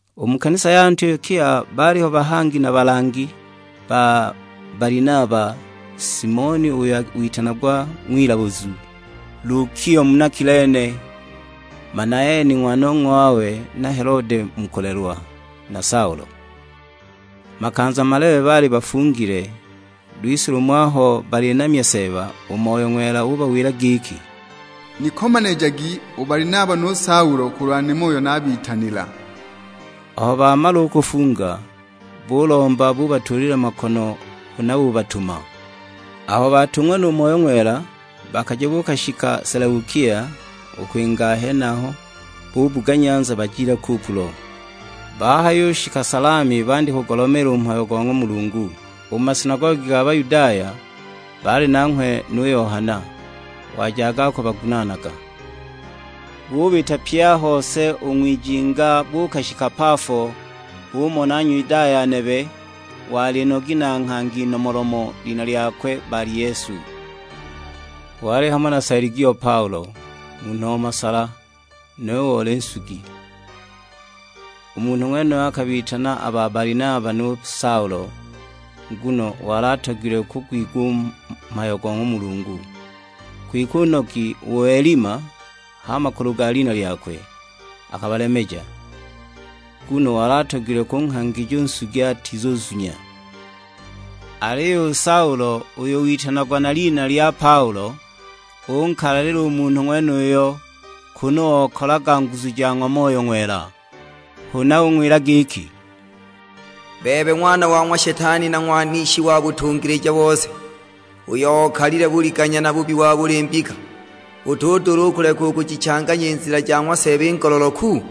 U mu kanisa ya Antiokia baaliho bahangi na balangi: ba Balinaba, Simioni uyo witanagwa ng'wilabuzu, Lukio muna Kilene, Manaeni ng'wanong'wawe na Helode mu kulelwa, na Saulo. Makanza malebe baali bafungile, lwise lumo aho balinamya Seeba, u Moyo Ng'wela ubawila giki, "Nikomanijagi u Balinaba nu Saulo kulwa nimo uyo naabitanila." Aho bamala u kufunga, bulomba, bubatuulila makono, huna bubatuma. Aho baatung'wa nu Moyo Ng'wela, bakaja buukashika Seleukia; u kwinga a henaho, bubuga nyanza bajile Kupulo. Bahayushika Salami bandya kugulomeela u mhayo go ng'wa Mulungu, u mu masinagogi ga Bayudaya; baali nanghwe nu Yohana, wajaga akubagunaanaga. Bubita pye a hose u ng'wijinga buukashika Pafo, bumona Nyudaya nebe, wali nogi na nghangi nomolomo; lina lyakwe Bali-yesu. Wali hamo na Seligio Paulo, munhu o masala; nuwe oli nsugi. U munhu ng'wenuyo akabitana a ba Balinaba nu Saulo, nguno wali atogilwe kugwigwa u mhayo go ng'wa Mulungu. Kwike u nogi u Elima (h'a makulu ga lina lyakwe) akabalemeja, nguno wali atogilwe kunghangija u nsugi atizuzunya. Aliyo u Saulo, uyo witanagwa na lina lya Paulo, unkalalila u munhu ng'wenuyo, kunu okalaga nguzu ja ng'wa Moyo Ng'wela. Huna ung'wila giki, "Bebe ng'wana wa ng'wa Shetani na ng'wanishi wa butungilija bose, uyo okalile buliganya na bubi wa buli mbika, utudula u kuleka u kujichaamya i nzila ja ng'wa Seeba i ngololoku?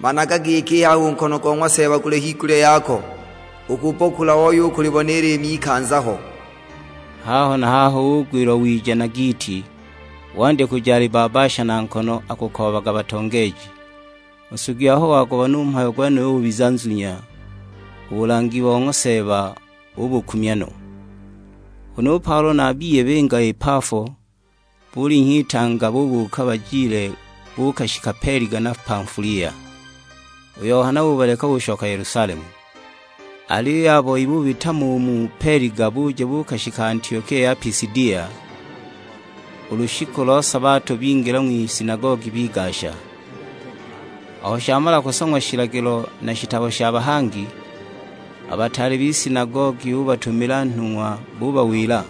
Managa giki i haha u nkono go ng'wa Seeba guli higulya yako, ukubbokula ooye u kulibona i liimi ikanza ho." Haho na haho ugwilwa wiija na giiti, wandya kuja alibbabbasha na nkono, akukoobaga batongeeji. U nsugi aho wagubona u mhayo gwenuyo ubiza nzunya, u bulangi bo ng'wa Seeba ubukumya no. Huna u Paulo na a biye binga i Pafo, bulinhya itanga bubuuka bajile buukashika Peliga ya Pamfulia. U Yohana ubaleka ushoka Yelusalemu. Aliyo a boi bubita mo u mu Peliga buja buukashika Antiokia ya Pisidia; u lushiku lo sabato bingila ng'wisinagogi bigasha. Aho shamala kusong'wa shilagilo na shitabo sha bahangi, a bataale b'isinagogi bubatumila nhung'wa bubawila,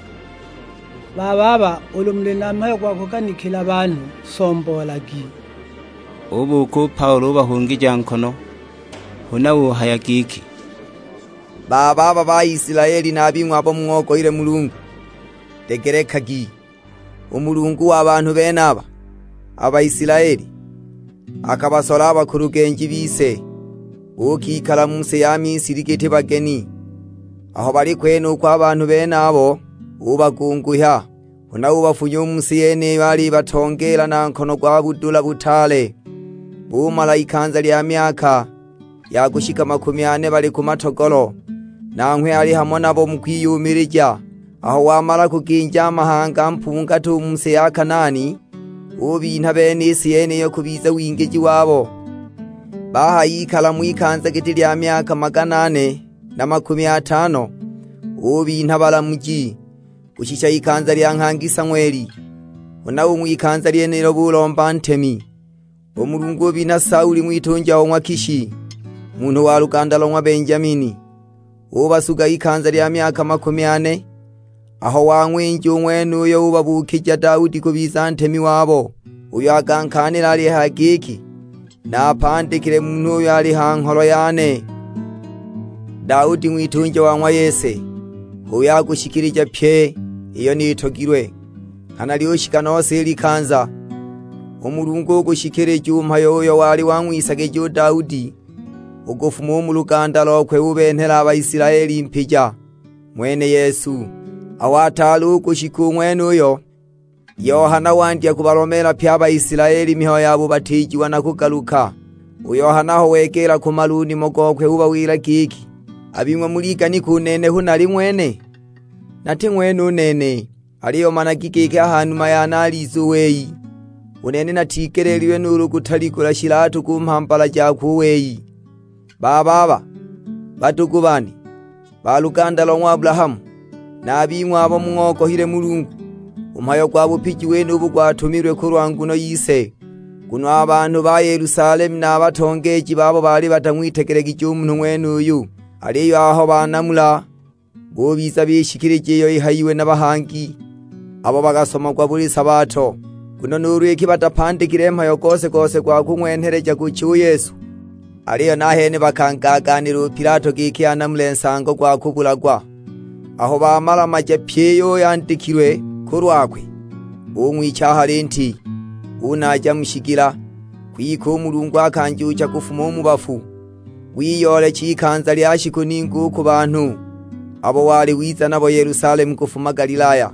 "Bababa ulu muli na mhayo gwa kuganikila banhu, somboolagi!" Ubuuka u Paulo ubahungija nkono; huna uhaya giki, "Bababa Baisilaeli na a bing'we abo mung'ogohile Mulungu; degelekagi. U Mulungu wa banhu benaba, a Baisilaeli, akabasola a bakulugenji bise. Buukikala mu si ya Misili giti bageni; aho bali kwenuko a banhu benabo ubagunguhya, huna ubafunya u mu si yeniyo alibatongeela na nkono gwa budula butaale. Bumala ikanza lya myaka ya kushika makumi ane bali ku matogolo, nanghwe ali hamo nabo mu kwiyumilija. Aho wamala kuginja mahanga mpungati u mu si ya Kanaani, ubinha bene i si yeniyo kubiza wingiji wabo. Bahayikala mo ikanza giti lya myaka magana ane na makumi atano, ubinha balamuji, kushisha ikanza lya nghangi Sang'weli. Huna u ng'wikanza lyenilo bulomba ntemi; u Mulungu ubinha Saulo ng'witunja o ng'wa Kishi, munhu wa luganda lo ng'wa Benjamini, ubasuga ikanza lya myaka makumi ane. Aho wang'winja u ng'wenuyo ubabuukija Daudi kubiza ntemi wabo; uyo akankaanila alihaya giki, 'Naapandikile munhu uyo ali ha ngholo yane, Daudi ng'witunja wa ng'wa Yese, h'uyo akushikilija pyi iyo nitogilwe.' Nghana lyushika nose i likanza, u Mulungu ugushikilija u mhayo uyo wali wang'wisagija u Daudi. U kufuma u mu luganda lokwe ubenhela a Baisilaeli Mpija, ng'wene Yesu. Aho ataali u kushika u ng'wenuyo, Yohana wandya kubalomeela pye a Baisilaeli mihayo ya bubatiijiwa na kugaluka. U Yohana aho wegeela kumala u nimo gokwe ubawila giki, 'A bing'we muliganika u nene hu nali ng'wene? Nati ng'wene u nene, aliyo managi giki a ha numa yane aliza u wei. U nene natigeleelilwe nuulu kutaligula shilatu ku mhambala jakwe u wei.' "Bababa, badugu bane, ba luganda lo ng'wa Abulahamu, na a bing'we abo mung'ogohile Mulungu, u mhayo gwa bupiji wenubu gwatumilwe kulwa nguno yise. Nguno a banhu ba Yelusalemu na a batongeeji babo baali batang'witegelegije u munhu ng'wenuyu, aliyo aho banamula, bubiza bishikilija iyo ihayiwe na bahangi abo bakasomagwa buli sabato. Nguno nuulu iki batapandikile mhayo gose-gose gwa kung'wenheleja kucha u Yesu, aliyo nahene bakangaagaanila u Pilato giki anamule nsango gwa kubulagwa. Aho bamala-maja pyi iyo yandikilwe kulwakwe, bung'wicha a ha linti, bunaaja mu shigila. Kwike u Mulungu akanjuucha kufuma u mu bafu. Wiyoolecha ikanza lya shiku ningi u ku banhu abo wali wiza nabo Yelusalemu kufuma Galilaya;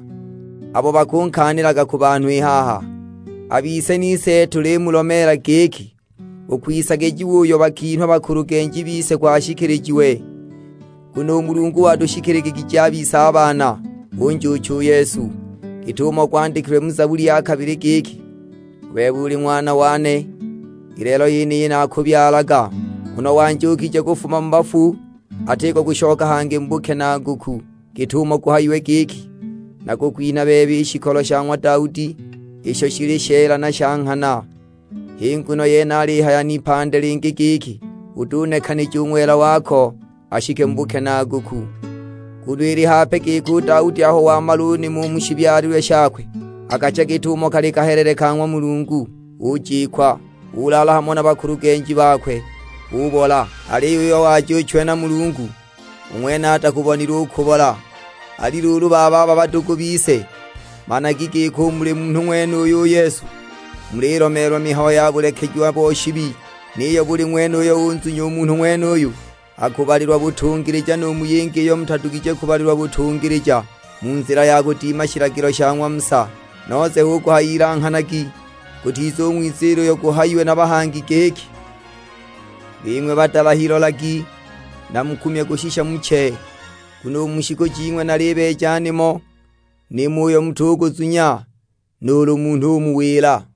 abo bakunkaanilaga ku banhu i haha. A bise nise tulimulomeela giki, u kwisagijiwa uyo bakinhwa bakulugenji bise kwashikilijiwe. Nguno u Mulungu watushikiligigije a bise baana, unjuucha u Yesu, git'umo gwandikilwe mu Zabuli ya kabili; giki, 'U bebe uli Ng'wana wane, i lelo yeniyi naakubyalaga.' Nguno wanjuukije kufuma mu bafu atiko kushoka hangi mu bukenaaguku, git'umo guhayiwe giki, 'Nakukwinha bebe i shikolo sha ng'wa Daudi, isho shili sheela na sha nghana.' H'i nguno yene alihaya n'ipandi lingi giki, 'Utunekanija u Ng'wela wako ashike mu bukenaaguku.' Nguno ili hape giki u Daudi aho wamala u nimo u mu shibyalilwe shakwe, akacha git'umo kali kahelele ka ng'wa Mulungu, ujikwa, ulaala hamo na bakulugenji bakwe, ubola. Aliyo uyo wajuuchiwe na Mulungu, u ng'wene atakubonile u kubola. Ali luulu bababa badugu bise, managi giki u muli munhu ng'wenuyu u Yesu, mulilomeelwa mihayo ya bulekejiwa bo shibi. Niyo buli ng'wene uyo unzunya u munhu ng'wenuyu, akubalilwa butungilija nu mu yingi iyo mutadugije kubalilwa butungilija mu nzila ya kudima shilagilo sha ng'wa Musa. Nose hu kuhaya ilanghanagi gutizung'wiziila uyo guhayiwe na bahangi giki, 'Bing'we badalahi lolagi, na mukumye kushisha muche, nguno u mu shiku jing'we nalibeeja nimo, nimo uyo mutuguzunya nuulu munhu umuwila.' "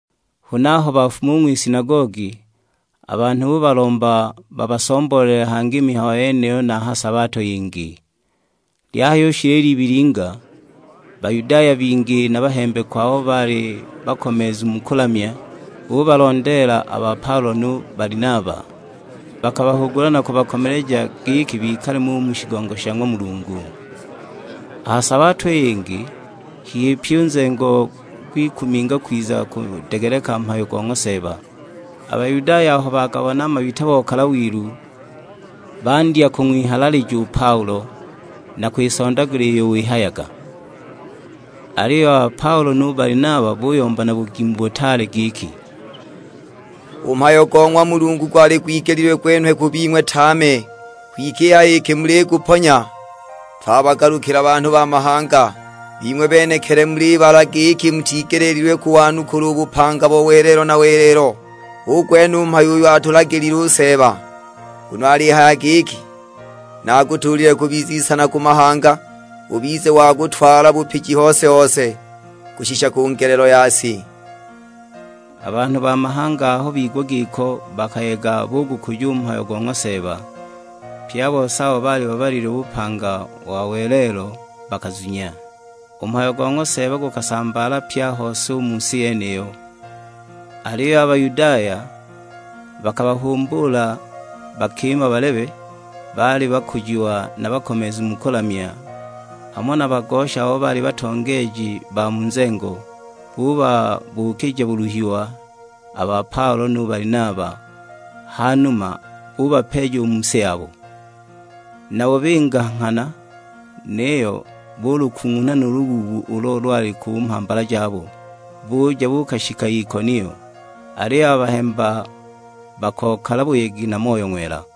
Huna aho bafuma u ng'wisinagogi, a banhu bubalomba babasomboolele hangi i mihayo yeniyo na ha sabato yingi. Lyahayushila i libilinga, Bayudaya bingi na bahembekwa abo baali bakomeezu mu kulamya, bubalondeela a ba Paulo nu Balinaba. Bakabahugula na kubakomeleja giki bikale mo u mu shigongo sha ng'wa Mulungu. A ha sabato i yingi, hihi pyi u nzengo gwikuminga kwiza kudegeleka mhayo go ng'wa Seeba. A Bayudaya aho bagabona a mabita bakokala wilu, bandya kung'wihalalija u Paulo, na kwisondagula iyo wihayaga. Aliyo a ba Paulo nu Balinaba buyomba na bugimu butaale giki, "U mhayo go ng'wa Mulungu gwali gwigelile gwenhwe ku bing'we tame; kwike i haha iki muliguponya, twabagalukila banhu ba mahanga. Bing'we benekili mulibala giki mutigeleelilwe kuwanukula u bupanga bo welelo na welelo. Hu gwene u mhayo uyo atulagilile u Seeba; nguno alihaya giki, 'Nakutuulile kubiza isana ku mahanga, ubize wa kutwala bupiji hose-hose, kushisha ku ngelelo ya si.' " A banhu ba mahanga aho bigwa giko bakayega bugukuja u mhayo go ng'wa Seeba. Pye a bose abo baali babalililwe bupanga bo welelo bakazunya. U mhayo go ng'wa Seeba gusambaala pye a hose u mu si yeniyo. Aliyo a Bayudaya bakabahumbuula bakima balebe, baali bakujiwa na bakomeezu mu kulamya, hamo na bagosha abo baali batongeeji ba mu nzengo; bubabuukija buluhiwa a ba Paulo nu Balinaba, hanuma bubapeeja u mu si yabo. Nabo binga nghana, niyo bulukung'unha nu lubuubu ulo lwali ku mhambala jabo; buja buukashika Ikonio. Aliyo a bahemba bakokala buyegi na Moyo Ng'wela.